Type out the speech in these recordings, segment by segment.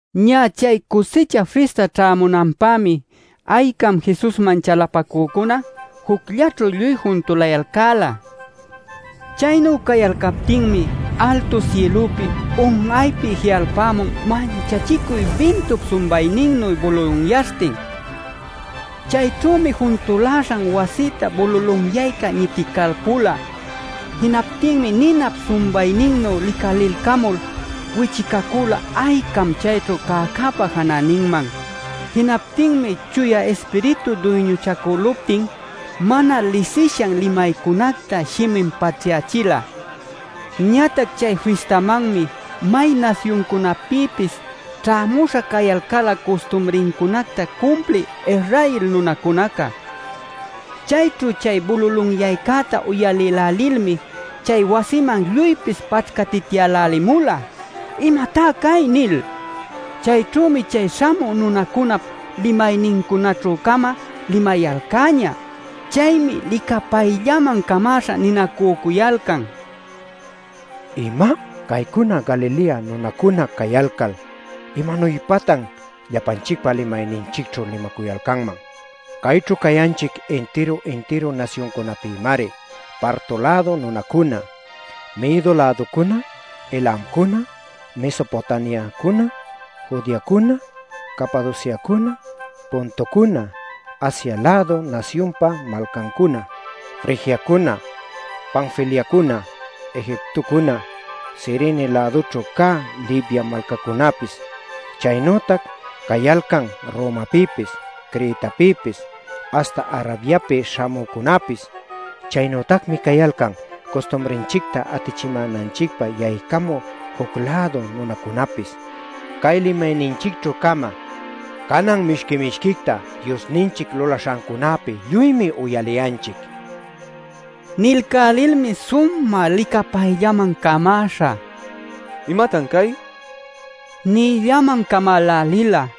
Ñä chay Cusicha Fista ćhämunanpämi aycam Jesusman chalapacücuna jucllaćhu lluy juntulayalcäla. Chaynu cayalcaptinmi altu sïlüpi un'aypi ji'alpämun manchachicuy bintup sumbayninnu bululunyaśhtin. Chayćhümi juntuläśhan wasïta bululunyayca ñiticalpula. Jinaptinmi ninap sumbayninnu licalilcamul wichicacüla aycam chayćhu cäcäpa janäninman. Jinaptinmi Chuya Ispiritu duyñuchacüluptin mana lisishan limaycunacta shimin paćhyachila. Ñatac chay fistamanmi may nasyuncunapïpis ćhämuśha cayalcäla custumrincunacta cumplï Israel nunacunaca. Chayćhu chay bululunyaycäta uyalïlälilmi chay wasiman lluypis paćhcatityälälimula “¿Imatá cay?” nil. Chayćhümi chay śhamü nunacunap limaynincunäćhü-cama limayalcäñä. Chaymi licapayllaman camäśha ninacücuyalcan: “¡¿Ima?! Caycuna Galilea nunacuna cayalcal ¿imanuypatan llapanchicpa limayninchicćhu limacuyalcanman? Cayćhu cayanchic intiru-intiru nasyuncunapïmari: Parto-lädu nunacuna, Medo-läducuna, Elamcuna, Mesopotamiacuna, Judeacuna, Capadociacuna, Pontocuna, Asia-lädu nasyunpa malcancuna, Frigiacuna, Panfiliacuna, Egiptocuna, Cirene-lädunćhu cä Libya malcancunäpis. Chaynütac cayalcan Romapïpis, Cretapïpis, aśhta Arabiapi śhamücunapis. Chaynütacmi cayalcan custumrinchicta atichimänanchicpä yaycamü juc-lädu nunacunapis. ¡Cay limayninchicćhü-cama canan mishqui-mishquicta Diosninchic lulaśhancunäpi lluymi uyaliyanchic!” nil. Nilcälilmi sumä licapayllaman camäśha: “¡¿Imatan cay?!” nïllaman camälälila.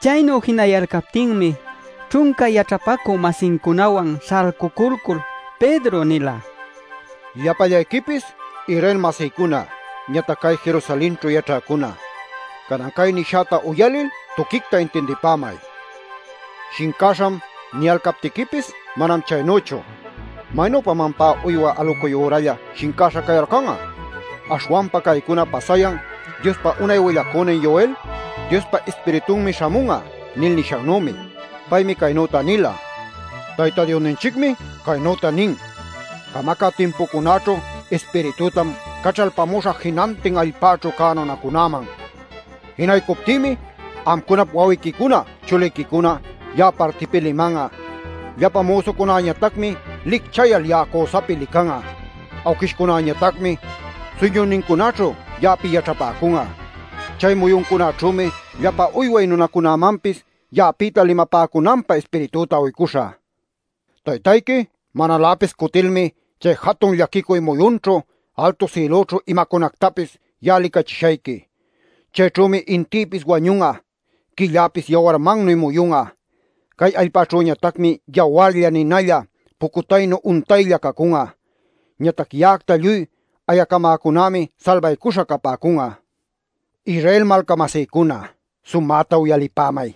Chaynu jinayalcaptinmi ćhunca yaćhapacü-masincunawan śhalcuculcul Pedro nila: “Llapallayquipis Israel-masïcuna, ñatac cay Jerusalenćhu yaćhäcuna, canan cay nishäta uyalil tuquicta intindipämay. ‘Shincäśham’ niyalcaptiquipis manam chaynüchu. ¿Maynüpam ampá uywa alucuy ürallalä shincaśha cayalcan'a? Aśhwanpa caycuna pasayan Diospa unay willacünin Joel ‘Diospa Ispiritunmi śhamun'a’ nil nishannümi. Paymi caynüta nila: ‘Tayta Diosninchicmi caynüta nin: “Camacä timpucunaćhu Ispiritütam caćhalpämuśhä jinantin allpäćhu cä nunacunäman. Jinaycuptïmi amcunap wawiquicuna chuliquicuna ya'a partipi liman'a. Llapa müsucunäñatacmi licchayal ya'a cüsapïta lican'a. Awquishcunäñatacmi suyñuynincunaćhu ya'api yaćhapäcun'a. Chay muyuncunaćhümi llapa uyway nunäcunamanpis, ya'apïta limapäcunanpä Ispiritüta uycuśhä. Taytayqui manaläpis cutilmi chay jatun llaquicuy muyunćhu altu sïlućhu imacunactapis ya'a licachishayqui. Chayćhümi intïpis wañun'a. Quilläpis yawarmannuy muyun'a. Cay allpäćhüñatacmi yawarlla, ninalla, pucutaynu untaylla cacun'a. Ñatac ya'acta lluy ayacamäcunämi salbaycuśha capäcun'a” ’ nil. “Israel malca-masïcuna, sumäta uyalipämay.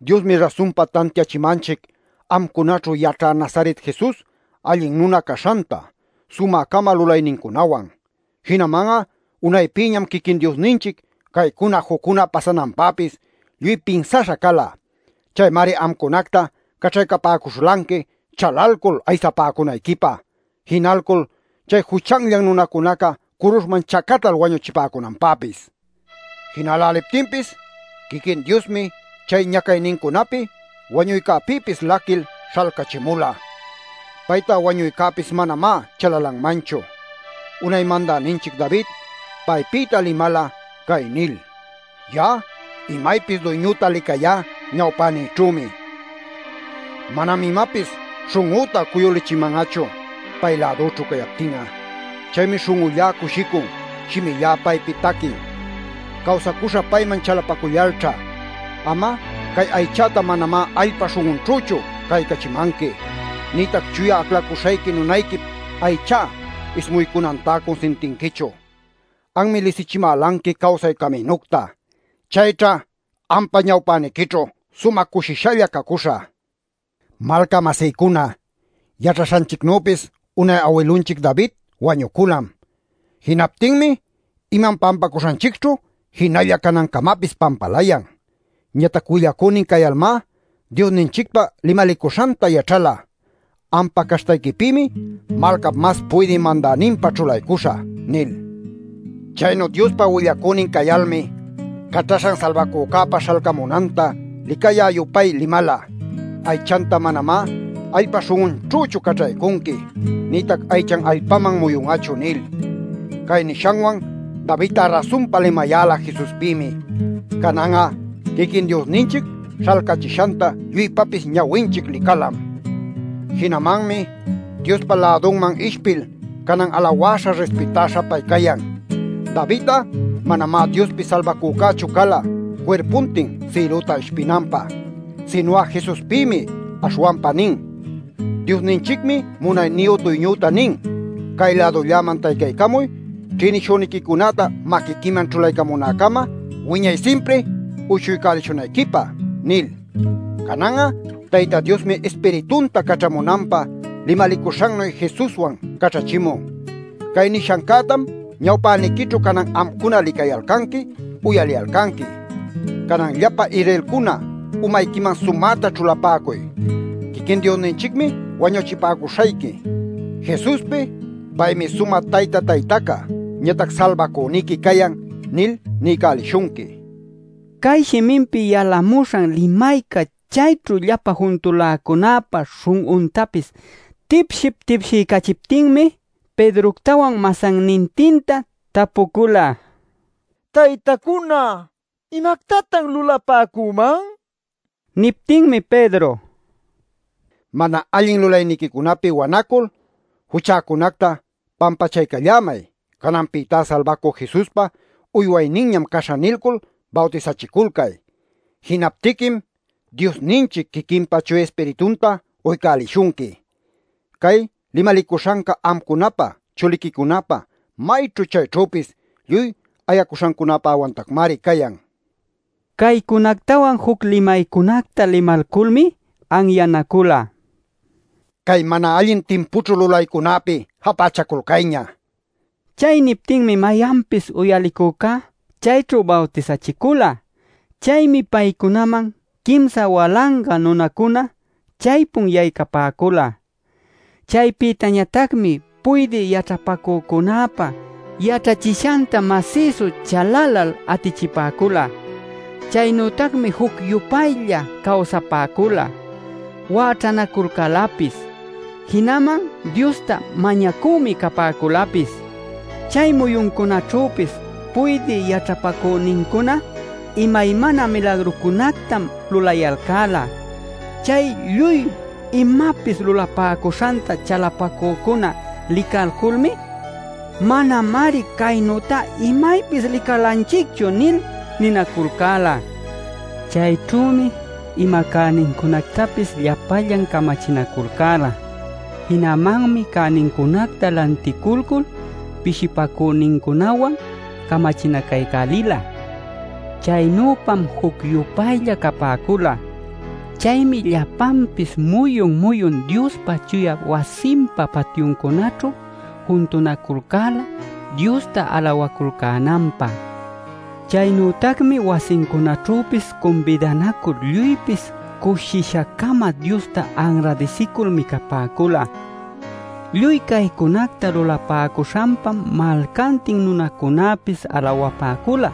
Diosmi rasunpa tantiachimanchic amcunaćhu yaćhä Nazaret Jesus allin nuna caśhanta sumä-cama lulaynincunawan. Jinaman'a unaypïñam quiquin Diosninchic caycuna juccuna pasananpäpis lluy pinsaśha cala. Chaymari amcunacta caćhaycapäcuśhulanqui chalalcul aysapäcunayquipä, jinalcul chay juchanllan nunacunaca curuśhman chacatal wañuchipäcunanpäpis. Jinäläliptinpis quiquin Diosmi chay ñacaynincunapi wañuycäpïpis laquil śhalcachimula. Payta wañuycäpis manamá chalalanmanchu. Unay mandäninchic David paypïta limala cay nil: ‘Ya'a imaypis Duyñüta licayá ñawpänïćhümi. Manam imapis śhun'üta cuyulichiman'achu pay lädüćhu cayaptin'a. Chaymi śhun'ullá cushicun; shimillá paypi taquin. Cawsacuśhä payman chalapacullalćha. Am'a cay aychäta manamá allpa śhun'unćhüchu caćhaycamanqui. Nïtac Chuya Aclacuśhayqui nunayquip aychá ismuycunantá cunsintinquichu. Anmi lisichimälanqui cawsay caminucta. Chayćha ampa ñawpäniquićhu sumä cushishalla cacuśhä’ nila. “Malca-masïcuna, yaćhaśhanchicnüpis unay awilunchic David wañuculam. Jinaptinmi imam pampacuśhanchicćhu jinalla canancamapis pampalayan. Ñatac willacünin cayalmá, Diosninchicpa limalicuśhanta yaćhala ‘Ampa caśhtayquipïmi malcap mas puydï mandäninpä ćhulaycuśhä’ nil. “Chaynu Diospa willacünin cayalmi Caćhaśhan Salbacüpa śhalcamunanta licayä-yupay limala ‘Aychanta manamá allpa śhun'unćhüchu caćhaycunqui. Nïtac aychan allpaman muyun'achu’ nil. Cay nishanwan David'a rasunpa limayäla Jesuspïmi. Canan'a quiquin Diosninchic śhalcachishanta lluypapis ñawinchic licalam. Jinamanmi Diospa lädunman ishpil canan alawäśha rispitäśha pay cayan. “David'a manamá Diospi Salbacücächu cala cuirpuntin sïlüta ishpinanpä. Sinu'a Jesuspïmi aśhwanpa nin: ‘Diosninchicmi munayniyu Duyñüta nin: “Cay-lädulläman taycaycamuy ćhïnishüniquicunäta maquiquiman ćhulaycamunäcama wiñay simpri uyshuycälishunayquipä” ’ nil. “Canan'a Tayta Diosmi Ispiritunta caćhamunanpä limalicuśhannuy Jesuswan caćhächimun. Cay nishancätam ñawpäniquićhu canan amcuna licayalcanqui uyaliyalcanqui. “Canan llapa Israelcuna umayquiman sumäta ćhulapäcuy: Quiquin Diosninchicmi wañuchipäcuśhayqui Jesuspi ‘Paymi sumä Tayta Taytaca ñatac Salbacüniqui cayan’ nil niycälishunqui” nila. Cay shiminpi yalamuśhan limayca chayćhu llapa juntuläcunäpa śhun'untapis tipship-tipshiycachiptinmi Pedroctawan masannintinta tapucula: “Taytacuna, ¿imactatan lulapäcüman?” nil. Niptinmi Pedro: “Mana allin lulayniquicunapi wanacul ‘Juchäcunacta pampachaycallämay. Cananpïtá Salbacü Jesuspa uywayninñam caśhä’ nilcul bawtisachiculcay. Jinaptiquim Diosninchic quiquinpa Chuya Ispiritunta uycälishunqui. Cay limalicuśhanca amcunapä, chuliquicunapä, mayćhu chayćhüpis lluy ayacuśhancunapäwantacmari cayan” nila. Caycunactawan juc limaycunacta limalculmi anyanacula: “Cay mana allin timpućhu lulaycunäpi japächaculcayña” nil. Chay niptinmi mayanpis uyalicücá chayćhu bawtisachicula. Chaymi paycunaman quimsa walanga nunacuna chaypun yaycapäcula. Chaypïtañatacmi puydï yaćhapacücunäpa yaćhachishanta masïsu chalalal atichipäcula. Chaynütacmi juc-yupaylla cawsapäcula, wäćhanaculcälapis, jinaman Diosta mañacümi capäculapis. Chay muyuncunaćhüpis puydï yaćhapacünincuna imaymana milagrucunactam lulayalcäla. Chay lluy imapis lulapäcuśhanta chalapacücuna licalculmi: “¡Manamari caynütá imaypis licalanchicchu!” nil ninaculcäla. Chayćhümi ima cänincunactapis llapallan camachinaculcäla. Jinamanmi cänincunacta lanticulcul pishipacünincunawan'a camachinacaycälila. Chaynüpam juc-yupaylla capäcula. Chaymi llapanpis muyun-muyun Diospa chuya wasinpa patyuncunaćhu juntunaculcäla Diosta alawaculcänanpä. Chaynütacmi wasincunaćhüpis cumbidanacul lluypis cushisha-cama Diosta anradisicul micapäcula. Lluy caycunacta lulapäcuśhanpam malcantin nunacunäpis alawapäcula.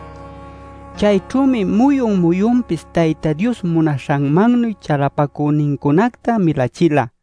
Chayćhümi muyun muyunpis Tayta Dios munacuśhanmannuy chalapacünincunacta milachila.